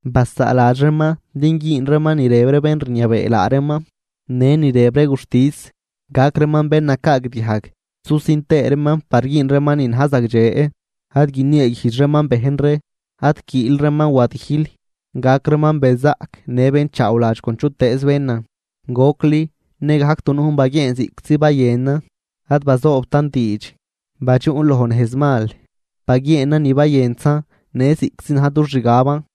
Basaaladx reeman din güün reeman ni rëb ree bén rniabee laa reeman në ni rëb ree guxtis, gac reeman bén nacaagdiajg susin tëë reeman par güün reeman ni na̱j zagdxe. Ad guinieeguijdx reeman bejn ree, ad quiil reeman wadijl, gac reeman benzaꞌc në bénchaawladx con chutëëz bénan. Gocli nëgajc dunujn baguieenan ziꞌctzi bayënan, ad bazoobtan diidx, badxuꞌn loj nejz mal, baguieenan ni bayëntzan në ziꞌctzi na̱j dux xgaban.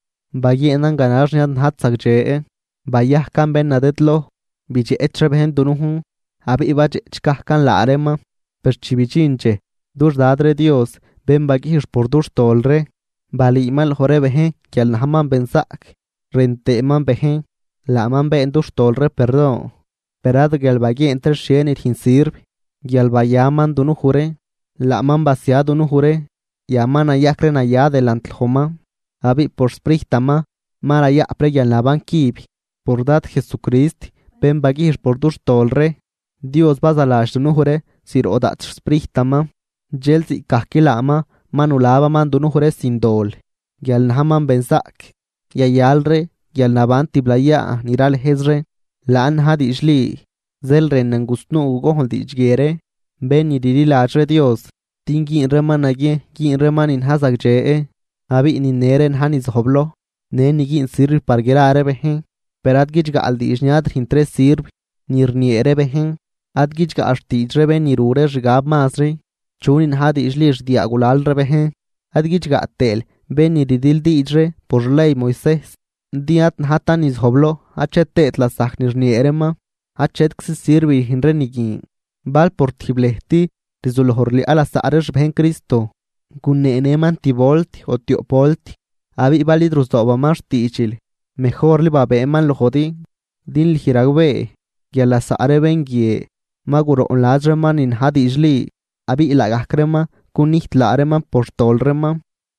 Baguieenan ganax ni ad najt zagdxe, bayajcan bén nadëdloj, bidxeꞌch ree bejn dunujn abiꞌ badxeꞌch gajcan laa reeman. Per chi bidxin dxej dux Dad ree Dios bén baguijx por dux tol ree, balüüman loj ree bejn guial najman benzaꞌc rën tëëman bejn. Laaman been dux tol ree perdon, per ad guial baguieent ree xhie ni rüjn sirv, guial bayaman dunuj ree. Laaman basia dunuj ree yan ma nayajc ree naya delant lojman, abiꞌ por xSprijtaman ma rayaꞌp ree guialnaban cüb. Por Dad Jesucrist bén baguijx por dux tol ree, Dios bazaladx dunuj ree zroꞌ daꞌt xSprijtaman. Dxel ziꞌcgajc laaman ma nulabaman dunuj ree sin dol guial najman benzaꞌc, yayal ree guialnaban tiblayaa ni ralëjz ree. Laan na̱j diidxli. Zeel rënan gusnuu gugojnl diidx guie ree bén ni rliladx ree Dios din güün reeman naguiejn güün reeman ni na̱j zagdxe. Abiꞌ nine ree na̱j ni zojbloj në ni güün sirv par gra ree bejn. Per ad guidxgaꞌl diidx ni ad rüjnt ree sirv ni rniee ree bejn, ad guidxgaꞌl xtiidx ree bén ni ru ree xgab mazri chunin na̱j diidxli xdiaa gulal ree bejn. Ad guidxgaꞌ tëël bén ni rdildiidx ree por xley Moisejs, din ad najtan ni zojbloj achet tëët lasajc ni rniee reeman, achetczi sirv rüjn ree ni guin. Bal por tijb lëjt rzuloj rliaꞌ lasaꞌ ree xbejn Cristo, guneenëman tib volt o tioꞌp volt, abiꞌ bal id ruzoobaman xtiidxil mejorli babëëman lojdi. Din lüj ragbee guial lasaꞌ ree bén guie ma guroꞌnladx reeman ni na̱j diidxli abiꞌ laagajc reeman cunijt laa reeman por xtol reeman.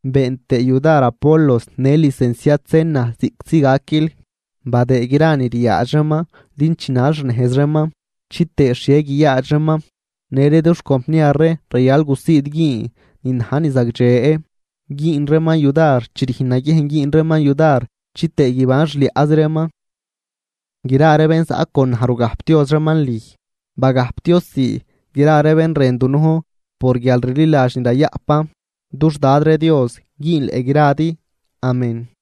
Been tëë yudar Apolos në licenciad Zena ziꞌctzi gaquil. Badëë gra ni ryaadx reeman din chinal xnejz reeman chitëë xhie guiyaadx reeman. Në ree dux compniar ree rayal gusiid güün ni na̱j ni zagdxe, güün reeman yudar chi rüjn naguiejn güün reeman yudar chitëë guiban xliaꞌzi reeman. Gra ree bén zaꞌ con naj rugajpdioz reeman lüj. Bagajpdioz sii gra ree bén rën dunujn por guialrliladx ni rayaꞌpan. Dux Dad ree Dios güünleꞌ gradi. Amén.